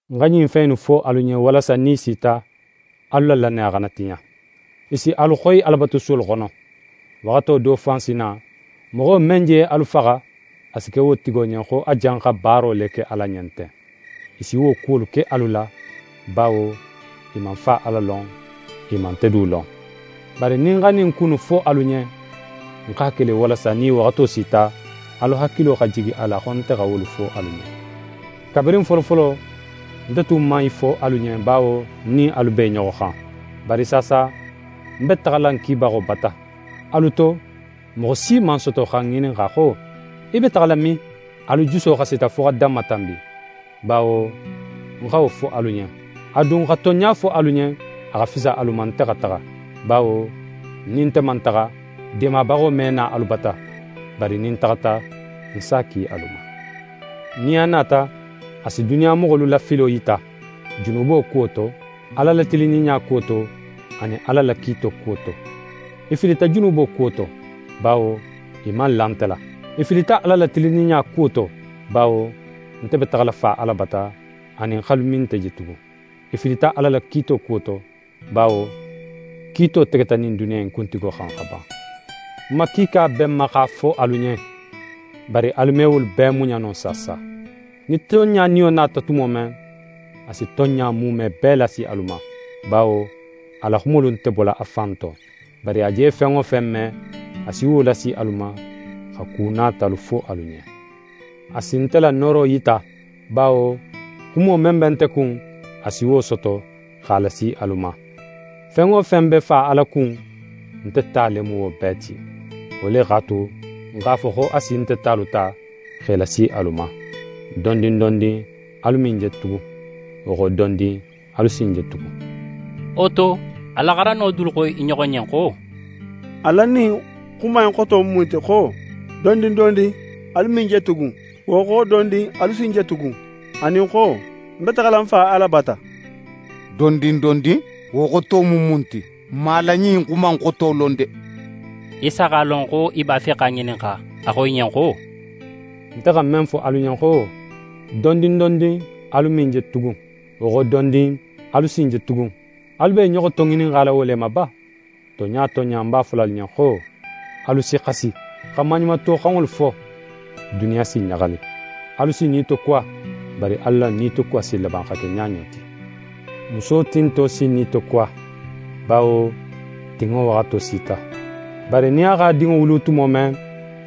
«Ń xa ɲin fen innu fo alu ɲen walasa nin i sita, alu la lannaya xana tiɲa. I si alu xoyi Alabatusuwolu xono. Waxato do fan si na, moxo men je alu faxa, a si ke wo tigo ɲen xo a janxa baaro le ke Ala ɲen ten. I si wo kuwolu ke alu la, bawo i man Fa Ala lon, i man nte du lon. Bari nin ń xa ɲin ku innu fo alu ɲen, ń x'a ke le, walasa nin i waxato sita, alu hakilo xa jigi a la xo nte xa wolu fo alu ɲen.» Kabirin folofolo, nte tun man i fo alu ɲen, bawo ń nin alu b'e ɲoxo xan. Bari saasa, ń be taxala ń kibaxo bata. Alu to moxo si man soto xa ń ŋininxa xo: “Í be taxala min?” Alu juso xasita fo xa danmatanbi, bawo ń xa wo fo alu ɲen. A dun, xa tonɲa fo alu ɲen, a xa fisa alu ma nte xa taxa; bawo nin nte man taxa, Deemabaxo me na alu bata. Bari nin ń taxata, ń s'a ki alu ma. Nin a nata, a si duniya moxolu la filo yita: Junubo kuwo to, Ala la tilinninɲa kuwo to, anin Ala la kiito kuwo to. I filita junubo kuwo to; bawo i man la nte la. I filita Ala la tilinninɲa kuwo to; bawo nte be taxala Fa Ala bata, anin x'alu me nte je tugun. I filita Ala la kiito kuwo to; bawo kiito tegeta ɲin duniya in kuntigo xan xa ban. «Xuma kiika be ń ma x'a fo alu ɲen, bari alu me wolu bee muɲa no saasa. Nin tonɲa Niyo nata tumo men, a si tonɲa muume bee lasi alu ma. Bawo a la xumolu nte bola a fan to. Bari a je fen wo fen me, a si wo lasi alu ma, xa ku natalu fo alu ɲen. A si nte la nooro yita, bawo xumo men be nte kun, a si wo soto, x'a lasi alu ma. Fen wo fen be Fa Ala kun, nte ta le mu wo bee ti. Wo le x'a tu, ń x'a fo xo a si nte talu ta, x'e lasi alu ma.» «Dondin dondin, alu me ń je tugun. Wo xo dondin, alu si ń je tugun.» Wo to, a la xarandinŋo dolu xo i ɲoxo ɲen xo: «A la ɲin xuma in xoto mu mun ti xo: “Dondin dondin, alu me ń je tugun, wo xo dondin, alu si ń je tugun,” anin xo: “Ń be taxala Fa Ala bata?” “Dondin dondin!” Wo xoto mu mun ti? N man a la ɲin xuma in xoto lon de.» Isa x'a lon, xo i b'a fe x'a ŋininxa. A xo i ɲen xo: «Nte xa men fo alu ɲen xo: “Dondin dondin, alu me ń je tugun, wo xo dondin, alu si ń je tugun”, alu be i ɲoxo toŋininxala wo le ma ba? Tonɲa tonɲa, ń b'a fola alu ɲen xo: Alu si xasi, xa maɲumatoxanŋolu fo, duniya si ɲaxali. Alu si nitokuwa, bari alu la nitokuwa si laban xa ke ɲaɲo ti. Muso tinto si nitokuwa, bawo tinŋo waxato sita. Bari nin a x'a dinŋo wulu tumo men,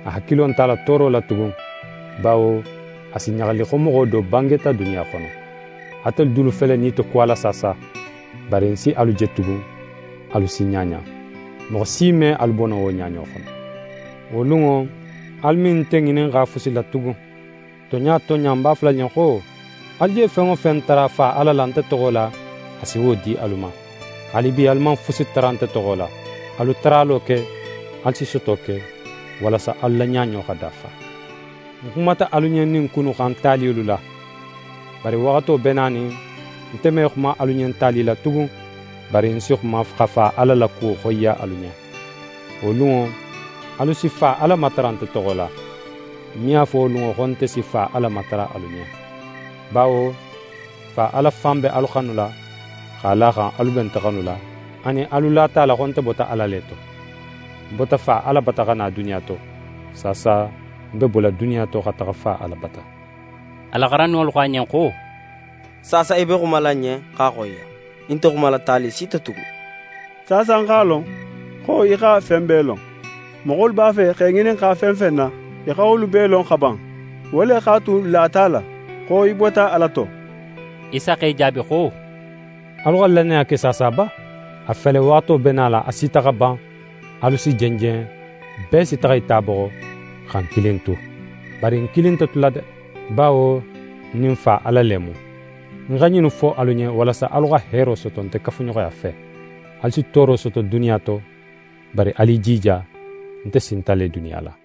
a hakilo nt'a la tooro la tugun, bawo a si ɲaxali xo moxo do bangeta duniya xono. Atelu dulu fele nitokuwala saasa. Bari ń si alu je tugun, alu si ɲaɲa. Moxo si me alu bo no wo ɲaɲo xono. Wo lunŋo, alu me nte ŋininxa fusi la tugun. Tonɲa tonɲa, ń b'a fola alu ɲen xo: Alu je fen wo fen tara Fa Ala la nte toxo la, a si wo di alu ma. Haalibi alu man fusi tara nte toxo la. Alu taralo ke, alu si soto ke, walasa alu la ɲaɲo xa dafa.» «Ń xumata alu ɲen ɲin ku innu xan taliyolu la. Bari waxato be nanin, nte me xuma alu ɲen tali la tugun, bari ń si xuma, xa Fa Ala la kuwo xoyiya alu ɲen. Wo lunŋo, alu si Fa Ala matara nte toxo la. Ń me a fo wo lunŋo xo nte si Fa Ala matara alu ɲen. Bawo Fa Ala fan be alu xanula x'a la a xan, alu be nte xanula, anin alu lata a la xo nte bota Ala le to. Ń bota Fa Ala bata xa na duniya to. Saasa ń be bola duniya to xa taxa Fa Ala bata.» A la xarandinŋolu xo a ɲen xo: «Saasa í be xumala n ɲen x'a xoyiya. Í nte xumala tali si to tugun. Saasa n x'a lon, xo í xa fen bee lon. Moxolu b'a fe x'é ŋininxa fen fen na, í xa wolu bee lon xa ban. Wo le x'a tu, n lata a la, xo í bota Ala to.» Isa x'e jaabi xo: «Alu xa lannaya ke saasa ba? A fele, waxato be nala, a sita xa ban, alu si jenjen, bee si taxa í ta boxo, xa ń kilin tu. Bari ń kilin nte tula de! Bawo ń nin Fa Ala le mu. Ń xa ɲinnu fo alu ɲen, walasa alu xa heero soto nte kafuɲoxoya fe. Alu si tooro soto duniya to, bari alu i jija, nte sinta le duniya la.»